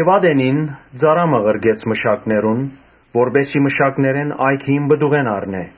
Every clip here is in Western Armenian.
Ատենին ծառայ մը ղրկեց մշակներուն, որպէս զի մշակներէն այգիին պտուղէն առնէ։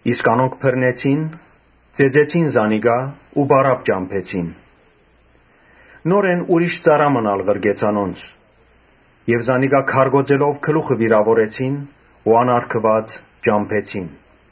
Իսկ անոնք բռնեցին, ծեծեցին զանիկա, պարապ ճամբեցին։ Նորէն ուրիշ ծառայ մըն ալ ղրկեց անոնց։ Զանիկա քարկոծելով գլուխը վիրաւորեցին ու անարգուած ճամբեցին։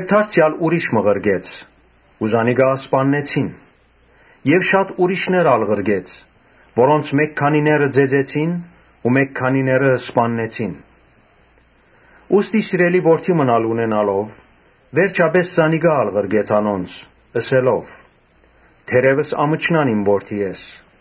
Դարձեալ ուրիշ մը ղրկեց։ Զանիկա սպաննեցին։ Շատ ուրիշներ ալ ղրկեց, որոնցմէ մէկ քանիները ծեծեցին ու մէկ քանիները սպաննեցին։ Ուստի՝ սիրելի որդի մըն ալ ունենալով, վերջապէս զանիկա ալ ղրկեց անոնց՝ ըսելով. «Թերեւս ամչնան իմ որդիէս»։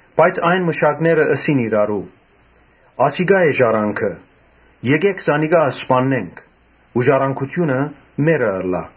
Բայց այն մշակները ըսին իրարու. «Ասիկա է ժառանգորդը. եկէք զանիկա սպաննենք ու ժառանգութիւնը մերը ըլլայ»։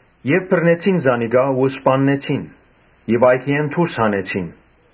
Բռնեցին զանիկա ու սպաննեցին ու այգիէն դուրս հանեցին։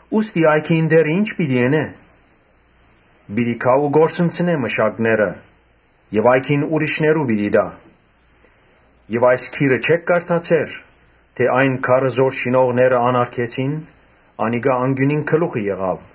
Ուստի այգիին տէրը ի՞նչ պիտի ընէ։ Պիտի գայ ու կորսնցնէ մշակները եւ այգին ուրիշներու պիտի տայ։ Այս գիրը չէ՞ք կարդացեր, թէ ‘Այն քարը, որ շինողները անարգեցին, անիկա անկիւնին գլուխը եղաւ’.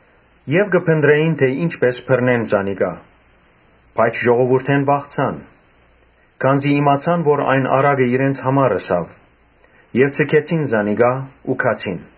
Մտածեցին բռնել զանիկա, բայց ժողովուրդէն վախցան, քանզի իմացան որ այն առակը իրենց համար ըսաւ եւ ձգեցին զանիկա ու գացին։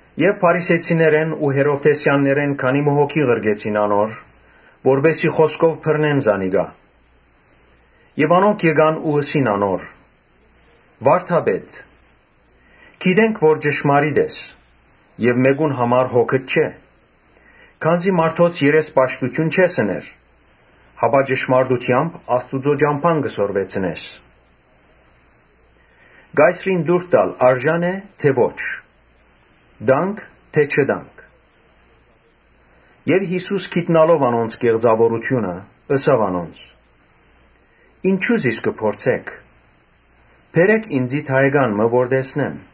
Եւ Փարիսեցիներն ու Հերովդէսեանները քանի մը հոգի ղրկեցին անոր, որպէս զի խօսքով բռնեն զանիկա։ Անոնք եկան ու ըսին անոր. «Վա՛րդապետ, գիտենք թէ ճշմարտասէր ես եւ մէկո՛ւն համար հոգդ չէ, քանզի մարդոց երեսպաշտութիւն չես ըներ, հապա ճշմարտութեամբ Աստուծոյ ճամբան կը սորվեցնես. Կայսրին տուրք տալ օրինաւո՞ր է։ Տա՞նք թէ չտանք»։ Յիսուս գիտնալով անոնց կեղծաւորութիւնը՝ ըսաւ անոնց. «Ինչո՞ւ զիս կը փորձէք։ Բերէ՛ք ինծի դահեկան մը որ տեսնեմ»։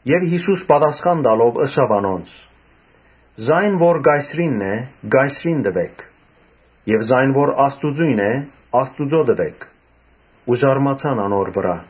Յիսուս պատասխան տալով ըսաւ անոնց. «Ա՛յն որ Կայսրինն է՝ Կայսրին տուէք եւ ա՛յն որ Աստուծոյն է՝ Աստուծոյ տուէք»։ Ու զարմացան անոր վրայ։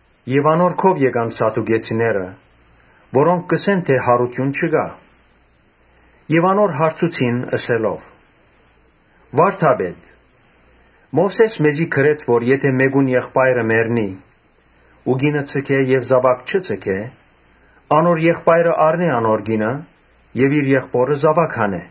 Անոր քով եկան սադուկեցիներ, որոնք կ’ըսեն թէ յարութիւն չկայ եւ անոր հարցուցին՝ ըսելով. «Վարդա՛պետ, Մովսէս մեզի գրեց թէ՝ ‘Եթէ մէկուն եղբայրը մեռնի ու կինը ձգէ եւ զաւակ չունենայ, անոր եղբայրը առնէ անոր կինը եւ իր եղբօրը զաւակ տայ’։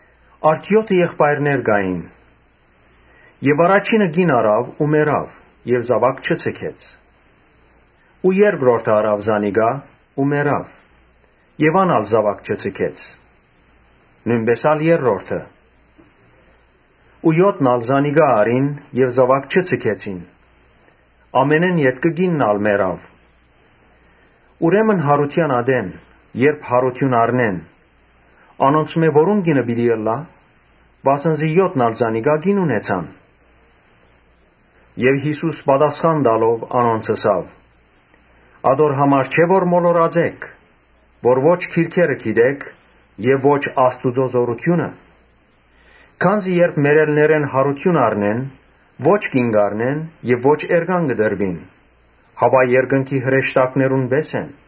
Արդ եօթը եղբայրներ կային։ Առաջինը կին առաւ ու մեռաւ եւ զաւակ չունեցաւ։ Երկրորդը առաւ զանիկա ու մեռաւ։ Ան ալ զաւակ չունեցաւ. նոյնպէս ալ երրորդը։ Ու եօթն ալ զանիկա առին եւ զաւակ չունեցան. ամենէն ետքը կինն ալ մեռաւ։ Ուրեմն յարութեան ատեն, երբ յարութիւն առնեն, անոնցմէ որո՞ւն կինը պիտի ըլլայ. վասն զի եօթն ալ զանիկա կին ունեցան»։ Յիսուս պատասխան տալով՝ անոնց ըսաւ. «Ատոր համար չէ՞ որ մոլորած էք, որ ո՛չ գրքերը գիտէք եւ ո՛չ Աստուծոյ զօրութիւնը։ Քանզի երբ մեռելներէն յարութիւն առնեն, ո՛չ կին կ’առնեն եւ ո՛չ էրկան կը տրուին, հապա երկնքի հրեշտակներուն պէս կ’ըլլան։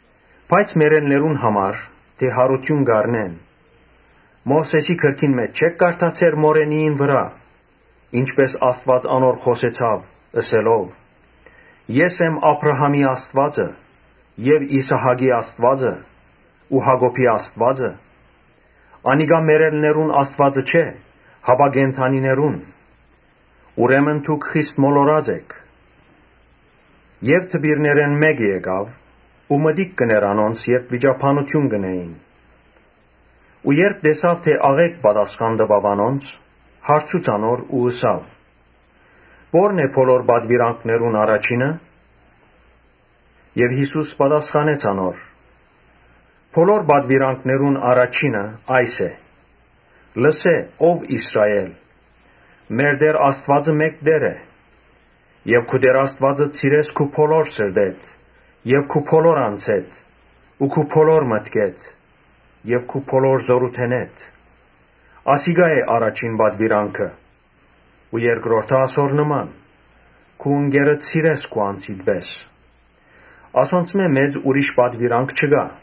Բայց մեռելներուն համար՝ թէ յարութիւն կ’առնեն, Մովսէսին գրքին մէջ չէ՞ք կարդացեր մորենիին վրայ, ի՛նչպէս Աստուած անոր խօսեցաւ՝ ըսելով. ‘Ես եմ Աբրահամին Աստուածը եւ Իսահակին Աստուածը ու Յակոբին Աստուածը’։ Անիկա մեռելներուն Աստուածը չէ, հապա կենդանիներուն. ուրեմն դուք խիստ մոլորած էք»։ Դպիրներէն մէկը եկաւ ու մտիկ կ’ընէր անոնց՝ երբ վիճաբանութիւն կ’ընէին ու երբ տեսաւ թէ աղէկ պատասխան տուաւ անոնց, հարցուց անոր ու ըսաւ. «Ո՞րն է բոլոր պատուիրանքներուն առաջինը»։ Յիսուս պատասխանեց անոր. «Բոլոր պատուիրանքներուն առաջինը այս է. ‘Լսէ՛, ո՛վ Իսրայէլ, մեր Տէր Աստուածը մէկ Տէր է’. ‘Եւ քու Տէր Աստուածդ սիրես քու բոլոր սրտովդ եւ քու բոլոր անձովդ ու քու բոլոր մտքովդ եւ քու բոլոր զօրութիւնովդ’։ Ասիկա է առաջին պատուիրանքը։ Ու երկրորդը ասոր նման. ‘Քու ընկերդ սիրես քու անձիդ պէս’. ասոնցմէ մեծ ուրիշ պատուիրանք չկայ»։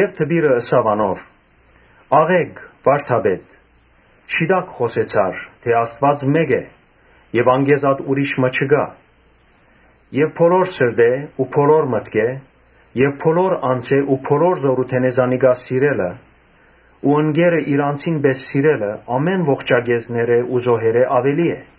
Դպիրը ըսաւ անոր. «Աղէկ, վա՛րդապետ, շիտակ խօսեցար թէ Աստուած մէկ է եւ անկէ զատ ուրիշ մը չկայ. Եւ բոլոր սրտով ու բոլոր մտքով եւ բոլոր անձով ու բոլոր զօրութիւնով զանիկա սիրելը ու ընկերը իր անձին պէս սիրելը ամէն ողջակէզներէ ու զոհերէ աւելի է»։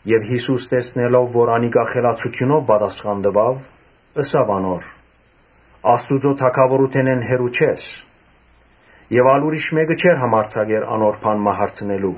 Յիսուս տեսնելով որ անիկա խելացութիւնով պատասխան տուաւ, ըսաւ անոր. «Աստուծոյ թագաւորութենէն հեռու չես»։ Եւ ա՛լ ուրիշ մէկը չէր համարձակեր անոր բան մը հարցնել։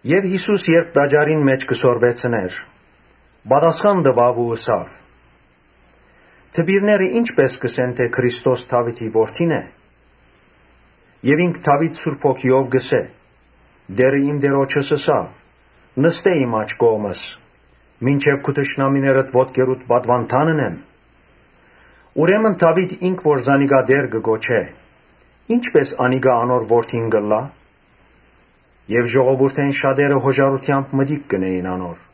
Երբ Յիսուս տաճարին մէջ կը սորվեցնէր՝ ըսաւ. «Դպիրները ինչպէ՞ս կ’ըսեն թէ Քրիստոս Դաւիթին որդին է։ Ինք՝ Դաւիթ Սուրբ Հոգիով կ’ըսէ. ‘Տէրը իմ Տէրոջս ըսաւ, Նստէ իմ աջ կողմս. մինչեւ քու թշնամիներդ ոտքերուդ պատուանդան ընեմ’։ Ուրեմն Դաւիթ ինք որ զանիկա Տէր կը կոչէ, ի՞նչպէս անիկա անոր որդին կ’ըլլայ»։ Ժողովուրդէն շատերը յօժարութեամբ մտիկ կ’ընէին անոր։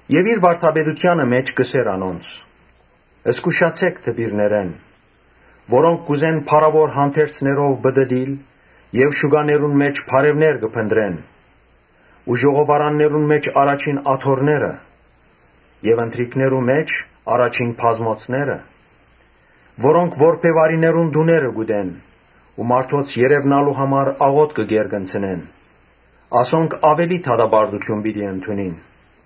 Իր վարդապետութեանը մէջ կ’ըսէր անոնց. «Զգուշացէ՛ք դպիրներէն, որոնք կ’ուզեն փառաւոր հանդերձներով պտըտիլ եւ շուկաներուն մէջ բարեւներ կը փնտռեն Ու ժողովարաններուն մէջ առաջին աթոռները եւ ընթրիքներու մէջ՝ առաջին բազմոցները. Որոնք որբեւարիներուն տուները կ’ուտեն ու մարդոց երեւնալու համար աղօթքը կ’երկնցնեն։ Ասոնք աւելի դատապարտութիւն պիտի ընդունին»։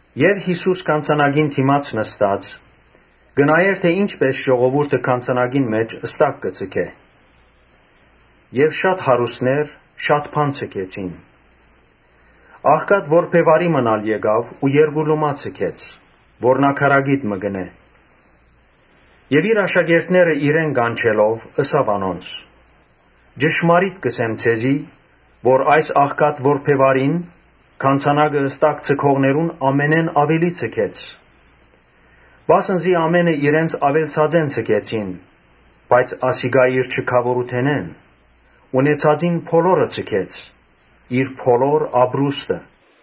Եւ Յիսուս գանձանակին քով նստած՝ կը նայէր թէ ժողովուրդը գանձանակին մէջ ի՛նչպէս ստակ կը ձգէ։ Շատ հարուստներ շատ բան ձգեցին։ Աղքատ որբեւարի մըն ալ եկաւ ու երկու լումայ ձգեց, որ նաքարակիտ մը կ’ընէ։ Իր աշակերտները իրեն կանչելով՝ ըսաւ անոնց. «Ճշմարիտ կ’ըսեմ ձեզի, թէ այս աղքատ որբեւարին գանձանակը ստակ ձգողներուն ամենէն աւելին ձգեց. Վասն զի ամէնքը իրենց աւելցածէն ձգեցին, բայց ասիկա իր չքաւորութենէն՝ ունեցածին բոլորը ձգեց՝ իր բոլոր ապրուստը»։